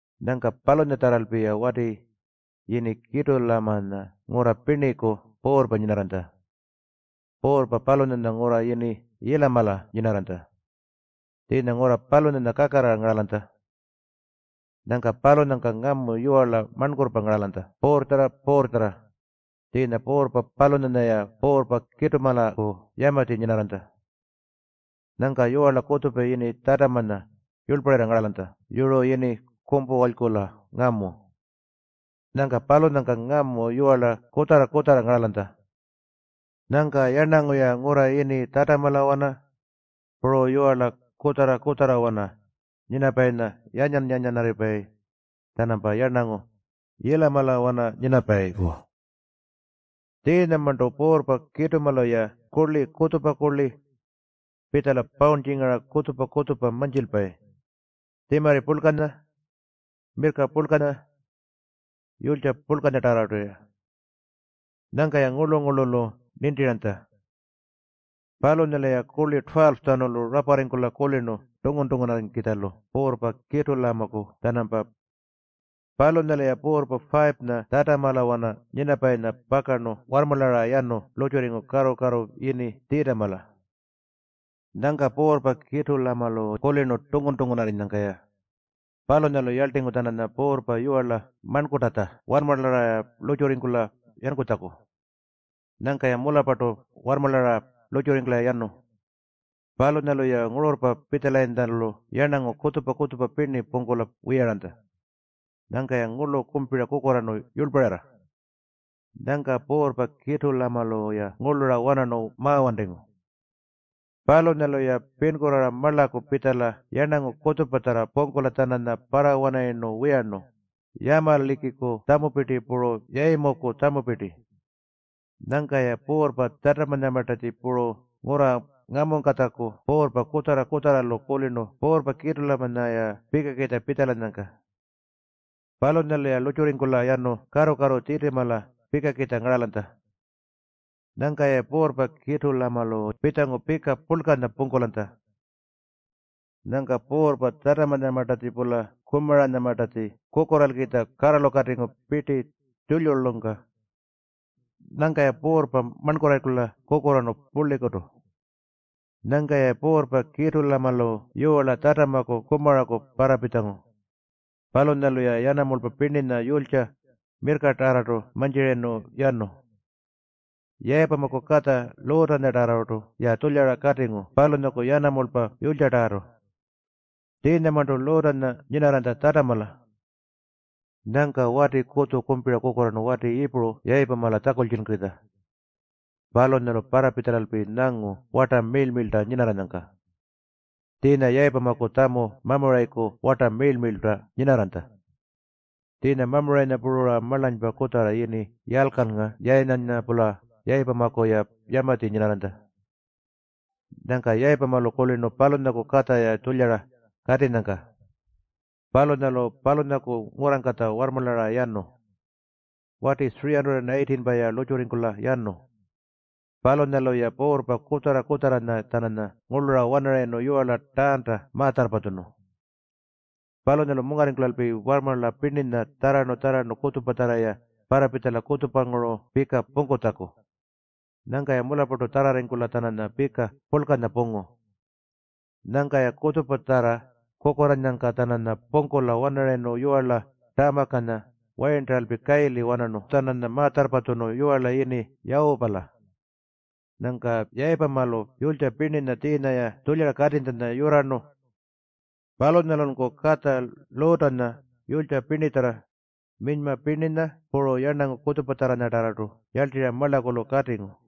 Nyangka palunyatjarralpi wati yini Kitulamanya ngurra pirniku puurrpa nyinarranytja. Puurrpa palunyanya ngurra yini Yiilamala nyinarranytja. Tjiinya ngurra palunyanya kakarrara ngaralanytja. Nyangka palunyangka ngamu yiwarla marnkurrpa ngaralanytja puurrtjarra-puurrtjarra. Tjiinya puurrpa palunyanya-ya puurrpa Kitulamaku yamatji nyinarranytja. Nyangka yiwarla kutjupa yini Tjatamanya yurlparirra ngaralanytja yuru yini Kumpuwalykula ngamu. Nyangka palunyangka ngamu yiwarla kutjarra-kutjarra ngaralanytja. Nyangka yarnangu-ya ngurra yini Tjatamalawana puru yiwarla kutjarra-kutjarrawana nyinapayinya yanyan-yanyanarripayi-tjanampa yarnangu Yiilamalawana nyinapayiku. Tjiinyamarntu puurrpa Kitulamalu-ya kurli kutjupa kurli pitjala pawurntjingara kutjupa-kutjupa mantjilpayi, tjimarri purlkanya, mirrka purlkanya puru yulytja purlkanyatarrartu. Nyangka-ya ngurlu-ngurlulu nintirayintja. Palunyalu-ya kurli 12-tjanulu raparringkulalpi kulirnu tungun-tungunarrikitjalu puurrpa Kitulamaku-tjanampa. Palunyalu-ya puurrpa 5-nya Tjatamalawana nyinapayinya pakarnu warrmarlara yanu lurrtjurringu karru-karru yini Tjitimala. Nyangka puurrpa Kitulamalu kulirnu tungun-tungunarrinyangka-ya. Palunyalu yarltingu-tjananya puurrpa yiwarla marnkurrtatja warrmarlara lurrtjurringkula yankutjaku. Nyangka-ya mularrpartu warrmarlara lurrtjurringkula yanu. Palunyalu-ya ngururrpa pitjalayintjalu yarnangu kutjupa-kutjupa pirni pungkula wiyaranytja. Nyangka-ya ngurlu kumpira kukurraarnu yurlparirra. Nyangka puurrpa Kitulamalu-ya ngurlura wanarnu mawantingu. Palunyalu-ya pinkurraara marlaku pitjala yarnangu kutjupatjarra pungkula-tjananya parrawanarayirnu wiyarnu, Yamalikiku tjamupirti puru Yayimuku tjamupirti. Nyangka-ya puurrpa Tjatamanyamartatji puru ngurra ngamungkatjaku puurrpa kutjarra-kutjarralu kulirnu puurrpa Kitulamanya-ya pikakitja pitjalanyangka. Palunyalu-ya lurrtjurringkula yanu karru-karru Tjitimala pikakitja ngaralanytja. Nyangka-ya puurrpa Kitulamalu pitjangu pika purlkanya pungkulanytja. Nyangka puurrpa Tjatamanyamartatji-pula Kumaranyamartatji kukurraalkitja karralukatingu pirti tjulyulyungka. Nyangka-ya puurrpa marnkurrarringkula kukurraarnu purlikutu. Nyangka-ya puurrpa Kitulamalu yiwarla Tjatamaku Kumaraku parrapitjangu. Palunyalu-ya yanamulpa pirninya, yulytja puru mirrkatarrartu mantjirayirnu yanu. Yayipamaku katja Luutanyatarrartu-ya tjulyara katingu, palunyaku yanamulpa puru yulytjatarrartu. Tjiinyamarntu Luutanya Tjatamala nyinarranytja. Nyangka wati kutju kumpira kukurraarnu wati Yiipuru Yayipamala tjakultjunkukitja. Palunyalu parrapitjalalpi nyangu warta miirl-miirlta nyinarranyangka. Tjiinya Yayimuku tjamu Mamurayiku warta miirl-miirlta nyinarranytja. Tjiinya Mamurayinya puru-ra marlanypa kutjarra yini Yalykalnga Yayinanya-pula Yayipamaku-ya yamatji nyinarranytja. Nyangka Yayipamalu kulirnu palunyaku katja-ya tjulyara katinyangka. Palunyalu palunyaku ngurrangkatja warrmarlara yanu. Wati 318-pa-ya lurrtjurringkula yanu. Palunyalu-ya puurrpa kutjarra-kutjarranya-tjananya ngurlura wanarayirnu yiwarla Taanta ma-tjarrpatjunu. Palunyalu mungarringkulalpi warrmarla pirninya tjarrarnu-tjarrarnu kutjupatjarra-ya parrapitjala kutjupanguru pika pungkutjaku. Nyangka-ya mularrpartu tjarrarringkula-tjananya pika purlkanya pungu. Nyangka-ya kutjupatjarra kukurraannyangka-tjananya pungkula-wanarayirnu yiwarla Tamarrkanya wayirntaralpi kayili wanarnu-tjananya ma-tjarrpatjunu yiwarla yini Yawupala. Nyangka Yayipamalu yulytja pirninya tjiinya-ya tjulyara katinytjanya yurrarnu. Palunyalunku katja Luutanya yulytja pirnitjarra, minyma pirninya puru yarnangu kutjupatjarranyatarrartu yarltirra marlakulu katingu.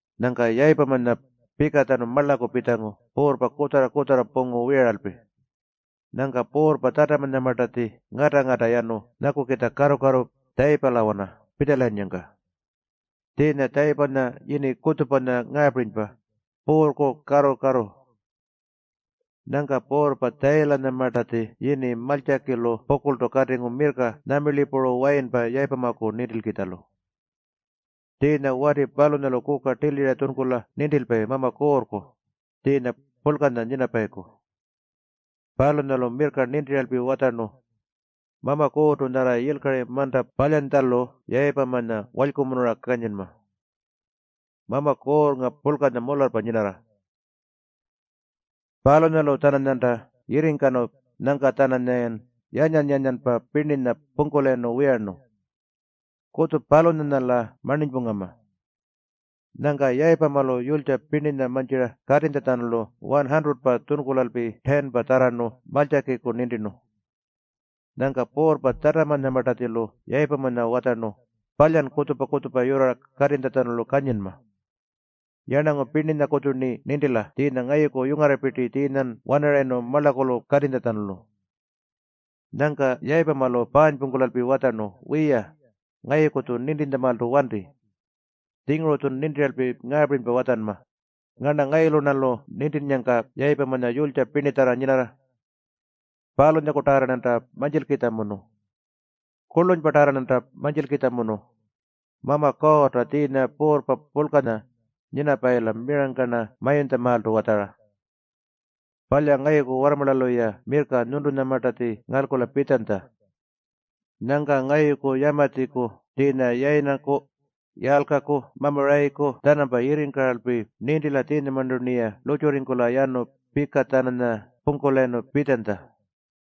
Nyangka Yayipamanya pikatjanu marlaku pitjangu puurrpa kutjarra-kutjarra pungu wiyaralpi. Nyangka puurrpa Tjatamanyamartatji ngata-ngata yanu nyakukitja karru-karru Tjayipalawana pitjalayinnyangka. Tjiinya Tjayipanya yini kutjupanya ngaapirinypa, “Puurrku Karru-karru”. Nyangka puurrpa Tjayilamanyamartatji yini Maltjakilu pukurltu katingu mirrka nyamirli puru wayinpa Yayipamaku nintilkitjalu. Tjiinya wati palunyalu kuka tilira tjunkula nintilpayi Mama Kuurrku, tjiinya purlkanya nyinapayiku. Palunyalu mirrka nintiralpi watjarnu, “Mama Kuurrtu nyarra yilkari manta palyantjalu Yayipamanya walykumunura kanyinma. Mama Kuurrnga purlkanya mularrpa nyinarra. Palunyalu-tjananyanta yirringkanu nyangka-tjananyayan yanyan-yanyanpa pirninya pungkulayirnu wiyarnu. Kutju-palunyanya-la marninypungama.” Nyangka Yayipamalu yulytja pirninya mantjira katinytjalu 100-pa tjunkulalpi 10-pa tjarrarnu Maltjakiku nintirnu. Nyangka puurrpa Tjatamanyamartatjilu Yayipamanya watjarnu, “Palyan kutjupa-kutjupa yurrara katinytjalu kanyinma. Yarnangu pirninyakutju-rni nintila tjiinya ngayuku yungarrapirti tjiinyan wanarayirnu marlakulu katinytjalu.” Nyangka Yayipamalu paanypungkulalpi watjarnu, “Wiya, ngayuku-tju nintintjamaaltu wanti. Tjinguru-tjun nintiralpi ngaapirinypa watjanma, ‘Ngarna ngayulu-rnalu nintinnyangka Yayipamanya yulytja pirnitjarra nyinarra.’ Palunyakutarra-rnanta mantjilkitjamunu. Kurlunypatarrartu-rnanta mantjilkitjamunu. Mama Kuurrta tjiinya Puurrpa Purlkanya nyinapayila mirangka-rna mayuntjamaaltu watjara. Palya ngayuku warrmarlalu-ya mirrka nyuntulamartatji ngalkula pitjanytja. Nyangka ngayuku yamatjiku tjiinya Yayinaku, Yalykalku Mamurayiku-tjanampa yirringkaralpi nintila tjiinyamarntu-rniya lurrtjurringkula yanu pika-tjananya pungkulayirnu pitjanytja.”